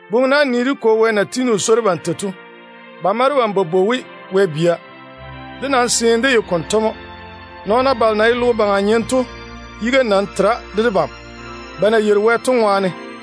Boŋe-na á nii dé Kwo Wɛ na tiini o swoi debam tei to. Ba ma debam ba bwoi we Wɛ bia. Dé nam seene dé ye konto mo. Nɔɔna balo na ye logo baŋa nyem to yiga nam tera de debam, ba na yeiri Wɛ to ŋwaane.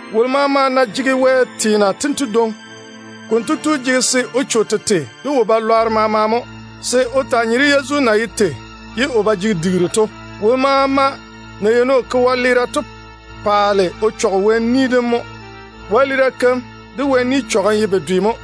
Wolo maama na daŋe o teena Wɛ baŋa ne tento dwoŋi to jege se o che o tete de wo-digiru maama mo, nenɛɛne Yezu na ye tei ye o ba jege digiru to. Wolo maama na yeini o ke wɛleera to paale o chɔge Wɛ ni dem mo. Wɛleera keim de Wɛ ni chɔgem ye bedwe mo.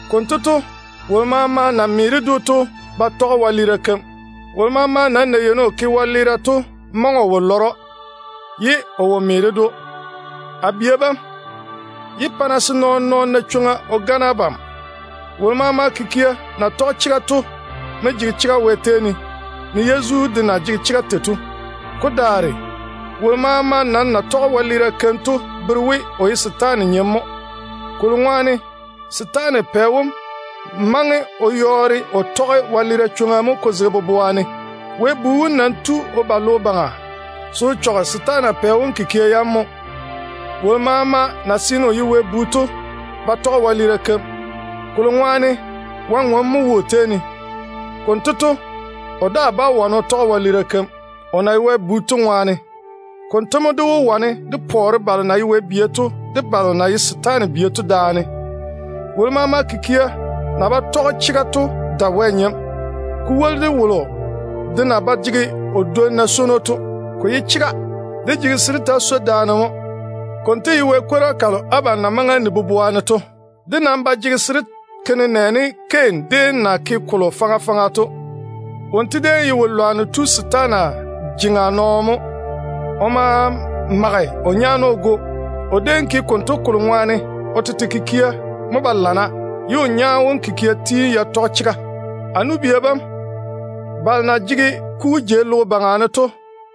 Konto to, wolo maama na me ded‑o to ba tɔge wɛleera keim. Wolo maama nam na yeini o ke wɛleera to maŋe o wo lɔre‑o, ye o wo me ded‑o. A bia bam, yé pa-na se nɔɔn-nɔɔno na chwoŋa o gane abam. Wolo maama kikia na tɔge chega to mo jege chega Wɛ tei ne, ne Yezu de na jege chega tei to. Ko daare wolo maama nam na tɔge wɛleera keim to bere we o ye setaane nyem mo, kolo ŋwaane setaana pɛ wom maŋe o yɔɔre o tɔge wɛleera chwoŋa mo ko zege boboa ne. Wɛ Bu wom nam tu logo baŋa se o chɔge setaana pɛ wom kikia yam mo. Wolo maama na seene o ye Wɛ bu to ba tɔge wɛleera keim, kolo ŋwaane Wɛ ŋwea mo wo o bochare ne. Konto to, o daa bá wane o tɔge wɛleera keim, o na ye Wɛ bu to ŋwaane. Konto mo dé wó wane dé pɔɔre balo na ye Wɛ bia to de balo na ye setaane bia to daane. Wolo maama kikia na ba tɔge chega to dae Wɛ nyem, ko woli de wolo de na ba jege o dwonna swono to. Ko ye chega, dé jege se dé taa swoi daane mo. Konto ye Wɛ kwora kalo abam na maŋe á ni boboa ne to. Dé nam ba jege se dé ke nenɛɛne Kain déem na ke kolo faŋa faŋa to. Wonto déem ye wo-lwanno tu setaane jeŋa nɔɔno mo. O ma mage o nyaane o go. O déem ke konto kolo ŋwaane o tete kikia mo ye wo-lwanno, ye o nyaane wom kikia yɔɔre ya tɔge chega. A nu-bia bam, balo na jege kugu jei logo baŋa ne to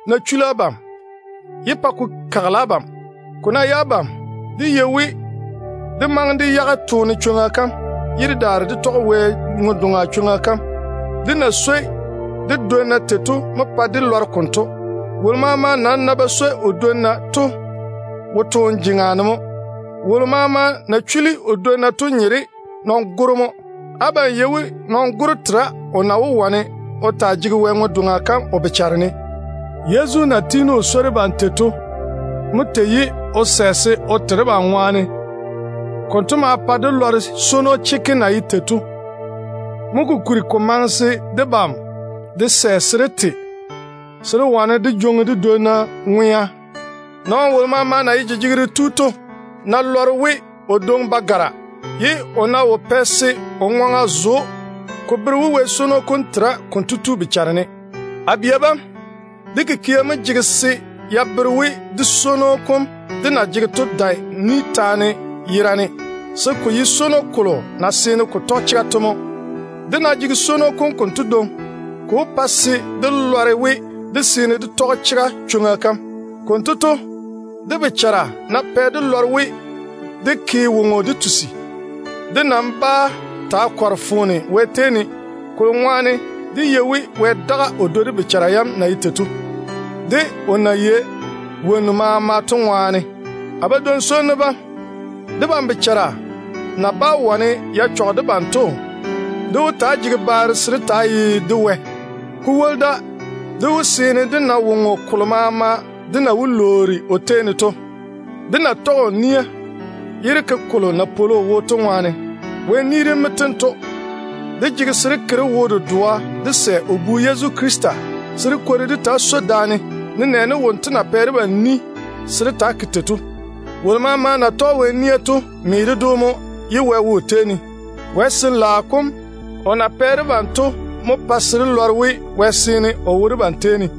ná chuli abam, yé pa-na ko kagele abam. Ko ná ye debam, dé yei we dé maŋe dé yage toone chwoŋa kam, ye dé daare dé tɔge Wɛ ŋwe-doŋa chwoŋa kam mo. Dé na swoi dé dwonna tei to mo pae dé lɔre konto. Wolo maama nam na ba swoi o dwonna to ta wo toone jeŋa ne mo. Wolo maama na chuli o dwonna to nye de nɔn-goro mo. Abam yei we nɔn-goro tera o na wó wane o taa jege Wɛ ŋwe-doŋa kam o bochare ne. Yezu na tiini o swoi debam tei to mo tei o sɛ se o te debam ŋwaane. Konto ma pa dé lɔre swono chekke na ye tei to. Mo kokuri ko maŋe se debam de sɛ se dé te, se dé wane dé jwoŋi dé dwonna ŋwea. Nɔɔno wolo maama na ye jejegero tu to ná lɔre we o dwoŋi ba gara, ye kotu ná wo pɛ se o ŋwaŋa zo‑o, ko bere we Wɛ swono kom tera o bochare ne. A bia bam, dé kikia mo jege se ya bere we, dé swono kom dé na jege to dae ni taane yerane, se ko ye swono kolo na seene ko tɔge chega to mo. Dé ná jege swono kom konto dwoŋi, ko wó pa se dé lɔre we, dé seene dé tɔge chega chwoŋa kam. Konto to, dé bochara ná pɛ dé lɔre we dé ke woŋo dé tusi, dé nam bá taa kɔre foone Wɛ yiga ne, kolo ŋwaane dé yei we Wɛ daga o dwoi dé bochara yam na ye tei to, de o na yei wonnu maama to. A badwoŋ-swonnu bam, debam bochara na bá wane ya chɔge debam to, dé wó taa jege baare se dé taa ye de Wɛ. Ko woli da, dé wó seene dé na woŋo kolo maama dé na wó lwoori o tei ne to, dé na tɔge o nia ye dé ke kolo na pwoli o wo to ŋwaane. Wɛ ni dem mo tento: dé jege se dé ke dé wo-dedoa de o Bu Yezu Krista, se dé kwori dé taa swoi daane, nenɛɛne wonto na pɛ debam ni se dé taa ke tei to. Wolo maama na tɔge Wɛ nia yam to me ded‑o mo, ye Wɛ wo o tei ne. Wɛ Sin-laao kom o na pɛ debam to mo pae se dé lɔre we, Wɛ seene o wo debam tei ne.